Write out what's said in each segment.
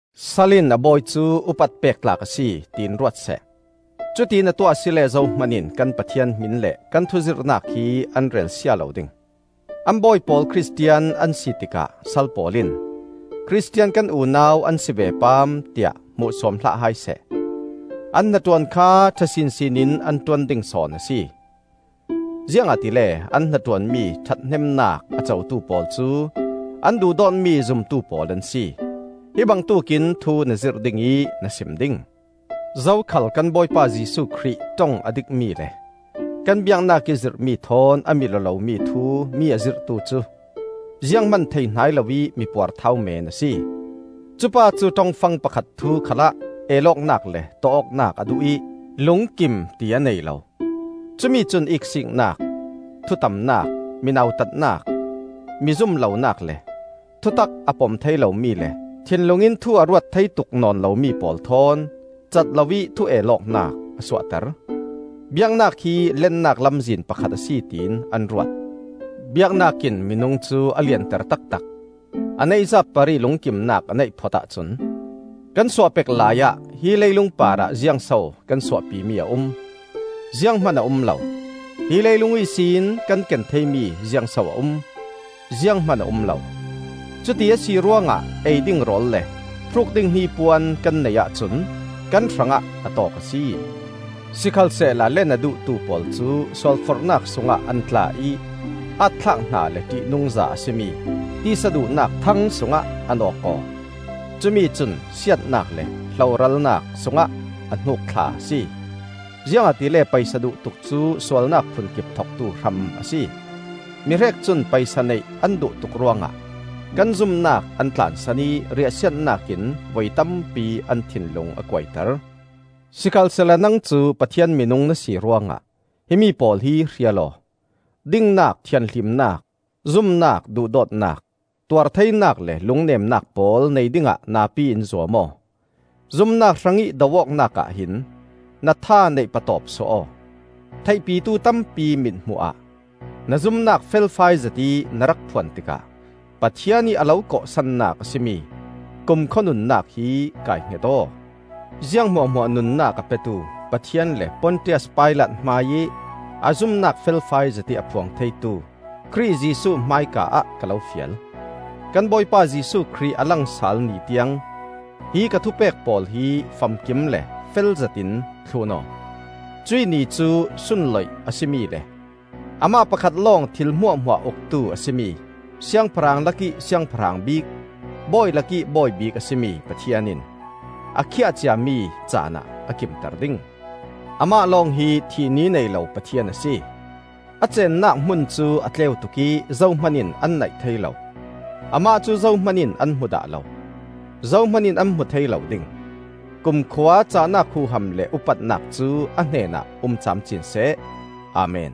Sal in a bawi cu upat pek tlak a si, tiin ruat seh. Cutiin a tuah asile zohman in kan Pathian hmin le kan thuzirhnak hi an relsia lo ding. An bawi pawl Khristian an si tikah sal pawl in, “Khristian kan unau an si ve paam,” tiah hmuhsuam hlah hai seh. An hnaṭuan kha ṭha sinsin in an ṭuan ding sawn a si; ziangahtile an hnaṭuanmi ṭhathnemnak a cotu pawl cu an duhdawtmi zumtu pawl an si. Zirhtu Sual Le Lennak Taktak Hi bangtuk in thu na zirh ding ih na sim ding. Zokhal kan Bawipa Jesuh Khrih ṭong a dikmi le kan biaknak ih zirhmi thawn a mil-aw lomi thu mi a zirhtu cu, zianghman thei hnai lo ih mi puarthau meen a si. Cupa cu ṭongfang pakhat thu khalah el awknak le tawh awknak a duh ih lungkim ti a nei lo. Cumi cun iksiiknak, thutamnak, mi nautatnak, mi zum lonak le, thutak a pom thei lomi le thinlung in thu a ruat thei tuk nawn lomi pawl thawn cat loih thu el awknak a suahter. Biaknak hi lennak lamzin pakhat a si tiin an ruat. Biaknak in minung cu a lianter taktak, a neihzat parih lungkimnak a neih phot ahcun! Kan suah pek laiah hi leilung parah ziangso kan suahpimi a um? Zianghman a um lo! Hi leilung ihsin kan ken theimi ziangso a um? Zianghman a um lo! Cuti a si ruangah ei ding rawl le hruk ding hnipuan kan neih ahcun kan hrangah a tawk a si. Sikhalsehla len a duhtu pawl cu sualforhnak sungah an tla ih aat-thlak hna le ṭihnungza a si mi tisa duhnak thang sungah an awk aw. Cumi cun siatnak le hloralnak sungah a hnuk thla a si. Ziangahtile paisa duhtuk cu sualnak phunkip thoktu hram a si. Mihrek cun paisa neih an duhtuk ruangah kan zumnak an tlansan ih riahsiatnak in voi tampi an thinlung a kuaiter. Sikhalsehla nang cu Pathian minung na si ruangah himi pawl hi hrial aw. Dingnak, thianhlimnak, zumnak, duhdawtnak, tuartheinak le lungnemnak pawl nei dingah napi in zuam aw. Zumnak hrangih do awknak ahhin na tha neih patawp suah aw. Theihpitu tampi mithmuh ah na zumnak felfai zetih na rak phuan tikah Pathian ih a lo kawhsannak a si mi kumkhua nunnak hi kai-hnget aw. Ziang hmuahhmuah nunnak a petu Pathian le Pontias Pilat hmaiih a zumnak felfai zetih a phuang theitu Khrih Jesuh hmaika-ah ka lo fial: Kan Bawipa Jesuh Khrih a lang sal Ni tiang hi ka thupek pawl hi famkim le felzetin thlun aw. Cuih Ni cu, sunloih a si mi le amah pakhat lawng thil hmuahhmuah Uktu a si mi, siangpahrang lakih Siangpahrang bik, bawi lakih Bawi bik a si mi Pathian in, a khiah ciami caanah a kimter ding. Amah lawng hi thih ni nei lo Pathian a si; a ceennak hmun cu a tleu tuk ih zohman in an naih thei lo. Amah cu zohman in an hmu dah lo; zohman in an hmu thei lo ding. Kumkhua cahnak huham le upatnak cu a hnenah um camcin seh! Amen.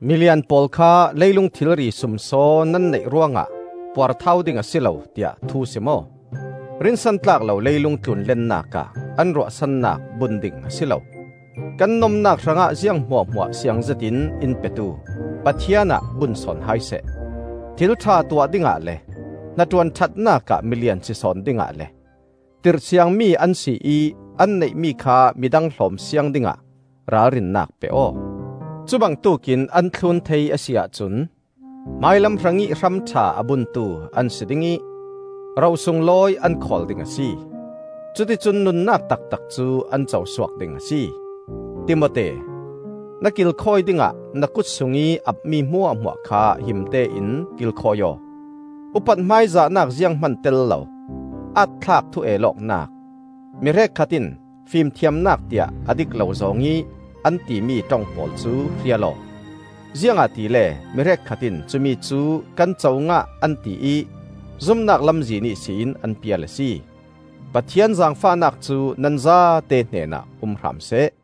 Milian pawl kha, “Leilung thilri sumsaw nan neih ruangah puarthau ding a si lo,” tiah thu sim aw. Rinsan tlak lo leilung tlun lennak ah an ruahsannak bun ding a si lo; kan nomnak hrangah ziang hmuahhmuah siangzet in in petu Pathian ah bun sawn hai seh. Thil ṭha tuah dingah le hnaṭuan ṭhatnak ah milian si sawn dingah le tirhsiangmi an si ih an neihmi kha midang hlawm siang dingah ralrinnak pe aw. Cu bangtuk in an thlun thei a si ahcun, hmailam hrangih hram ṭha a buntu an si ding ih ro sunglawi an khawl ding a si. Cuticun nunnak taktak cu an co suak ding a si. Timote, na kilkhawi dingah na kut sungih apmi hmuahhmuah kha himte in kilkhawi aw. Upat hmaizahnak zianghman tel lo, aat-thlak thu-el awknak, mi hrekkhat in “Fimthiamnak,” tiah a dik lo zawng ih an timi ṭong pawl cu hrial aw. Ziangahtile mi hrekkhat in cumicu kan co ngah an ti ih zumnak lamzin ihsin an pial a si. Pathian zaangfahnak cu nan zate hnenah um hram seh.